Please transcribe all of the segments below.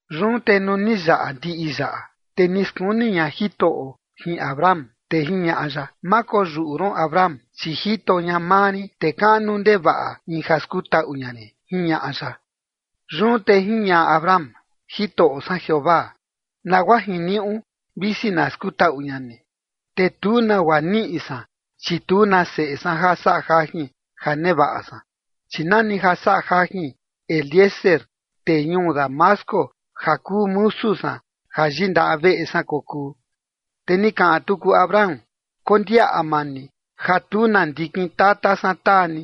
Yun te nuu ni yaꞌa ndiꞌi yaꞌa, te ni skuni ña Jitoꞌo jin Abram, te jiñaꞌa ya: ―Ma koyuꞌu ron, Abram, chi jito ña maa rin, te kaꞌnu ndevaꞌa in ja skutaꞌu ña rin ―jiñaꞌa ya. Yun te jiñaꞌa Abram: ―Jitoꞌo san Jeovaa, nagua jiniuꞌu visi na skutaꞌu ña ni, te tu nagua niꞌi san chi tu na seꞌe san ja saꞌa jajin ja nevaꞌa san, chi nani ja saꞌa jajin Eliezer, tee ñuu Damasco ja kuu musu san ja yindaꞌa veꞌe san kokuu. Te ni kaꞌan tuku Abram: ―Kondiaꞌa maa ni ja tu na ndikin tata san taa ni,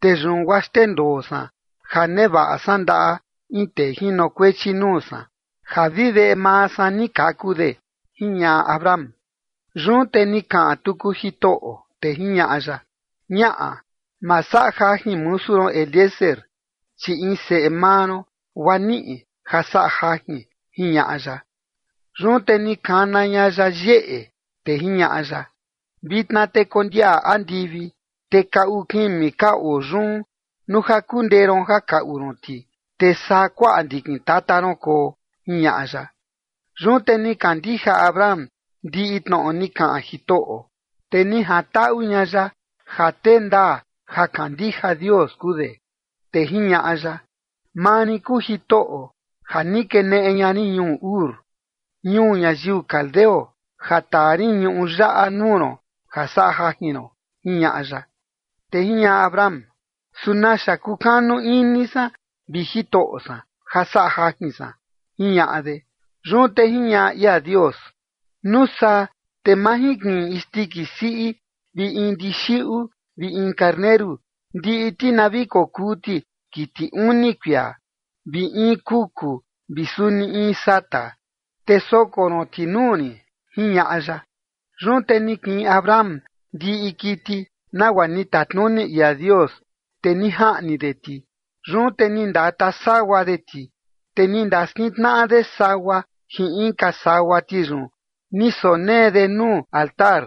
te yun guaa xndendoo san ja nevaꞌa san ndaꞌa in tee jinokuechi nuu san ja vi veꞌe maa san ni kaku de ―jiñaꞌa Abram. Yun te ni kaꞌan tuku Jitoꞌo, te jiñaꞌa ya: ―Ñaꞌa, ma saꞌa jajin musu ron Eliezer, chi in seꞌe maa ron guaa niꞌi ja saꞌa jajin ―jiñaꞌa ya. Yun te ni kana ña ya yeꞌe, te jiñaꞌa ya: ―Vitna te kondiaꞌa andivi, te kaꞌu kimi ka oo yun nuu ja kundee ron ja kaꞌu ron ti, te saa kuaꞌa ndikin tata ron koo ―jiñaꞌa ya. Yun te ni kandija Abram ndiꞌi tnoꞌo ni kaꞌan Jitoꞌo, te ni jantaꞌu ña ya ja tee ndaa ja kandija Dios kuu de. Te jiñaꞌa ya: ―Maa rin kuu Jitoꞌo ja ni keneꞌe ña rin ñuu Ur, ñuu ñayiu caldeo, ja taa rin ñuꞌu yaꞌa nuu ron ja saꞌa jajin ron ―jiñaꞌa ya. Te jiñaꞌa Abram: ―¿Su naxa kukanu ini san, vi Jitoꞌo san, ja saꞌa jajin san? ―jiñaꞌa de. Yun te jiñaꞌa ia Dios: ―Nuu saa te majinkiꞌin in isndiki siꞌi vi in ndixiꞌu vi in karneru ndiꞌi ti na vi kokuu ti kiti uni kuia, vi in kuku vi suni in sata, te soko ron ti nuu rin ―jiñaꞌa ya. Yun te ni kiꞌin Abram ndiꞌi kiti nagua ni tatnuni ia Dios, te ni jaꞌni de ti. Yun te ni ndata sagua de ti, te ni ndaskintnaꞌa de sagua jin inka sagua ti yun ni sonee de nuu altar,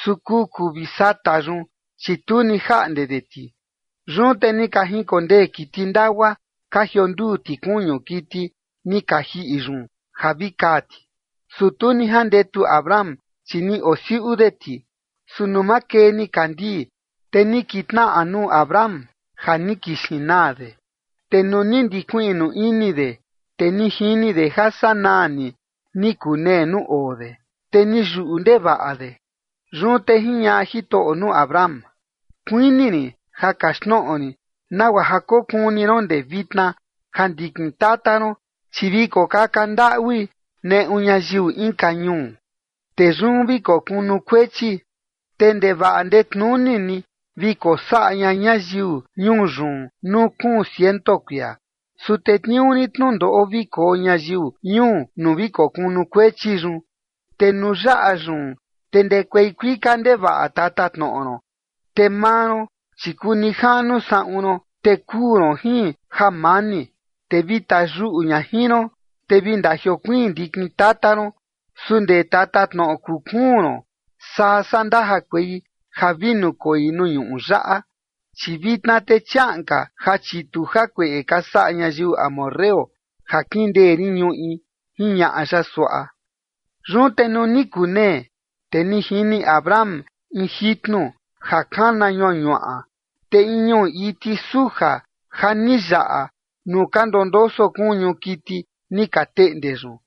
su kuku vi sata yun, chi tu ni jaꞌnde de ti. Yun te ni ka jinkondee kiti ndagua ka jionduu ti kuñu kiti ni ka jiꞌi yun ja vi kaa ti, su tu ni jandetu Abram, chi ni osiuꞌu de ti. Su nuu makee nikandii, te ni kitnaꞌa nuu Abram ja ni kixin naa de, te nuu ni ndikuiꞌnu ini de, te ni jini de ja sanaa ni ni kunee nuu oo de, te ni yuꞌu ndevaꞌa de. Yun te jiñaꞌa Jitoꞌo nuu Abram: ―Kuini rin ja kaxtnoꞌo rin nagua ja kokuni ron ndee vitna ja ndikin tata ron, chi vi kokaka ndaꞌui neꞌu ñayiu inka ñuu, te yun vi kokunukuechi, te ndevaꞌa ndetnuni ni vi kosaꞌa ña ñayiu ñuu yun nuu kuun ciento kuia. Su tetniuu rin tnundoꞌo vi koo ñayiu ñuu nuu vi kokunukuechi yun, te nuu yaꞌa yun, te ndekuei kuika ndevaꞌa tatatnoꞌo ron. Te maa ron, chi kuu nijaꞌnu saꞌun ron, te kuu ron jin jamani, te vi tayuꞌu ña jin ron. Te vi ndajiokuiin ndikin tata ron, su ndee tatatnoꞌo kuu kuun ron saa saa ndajakuei ja vi nukoi nuu ñuꞌu yaꞌa, chi vitna te chiaꞌan ka ja chitu jakueꞌe ka saꞌa ñayiu amorreo ja kindee rin ñuꞌi ―jiñaꞌa ya suaꞌa. Yun te nuu ni kunee, te ni jini Abram in jitnu ja kana ñuañuaꞌa, te in ñuꞌu iti suja ja ni yaꞌa nuu ka ndondoso kuñu kiti ni ka teꞌnde yun.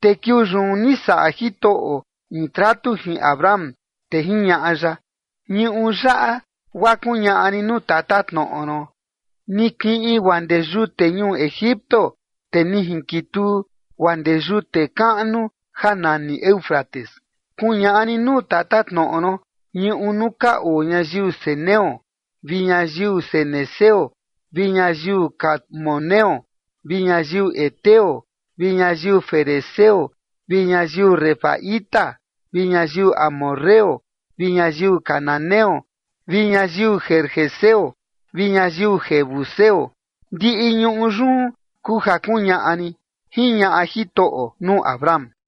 Te kiuu yun ni saꞌa Jitoꞌo in tratu jin Abram, te jiñaꞌa ya: ―Ñuꞌu yaꞌa guaa kuñaꞌa rin nuu tatatnoꞌo ron, ni kiꞌin guaa ndee yute ñuu Egipto, te ni jinkituu guaa ndee yute kaꞌnu ja nani Éufrates, kuñaꞌa rin nuu tatatnoꞌo ron ñuꞌu nuu ka oo ñayiu ceneo vi ñayiu cenezeo vi ñayiu cadmoneo vi ñayiu heteo vi ñayiu ferezeo vi ñayiu refaíta vi ñayiu amorreo vi ñayiu cananeo vi ñayiu gergeseo vi ñayiu jebuseo, ndiꞌi ñuꞌu yun kuu ja kuñaꞌa rin ―jiñaꞌa Jitoꞌo nuu Abram.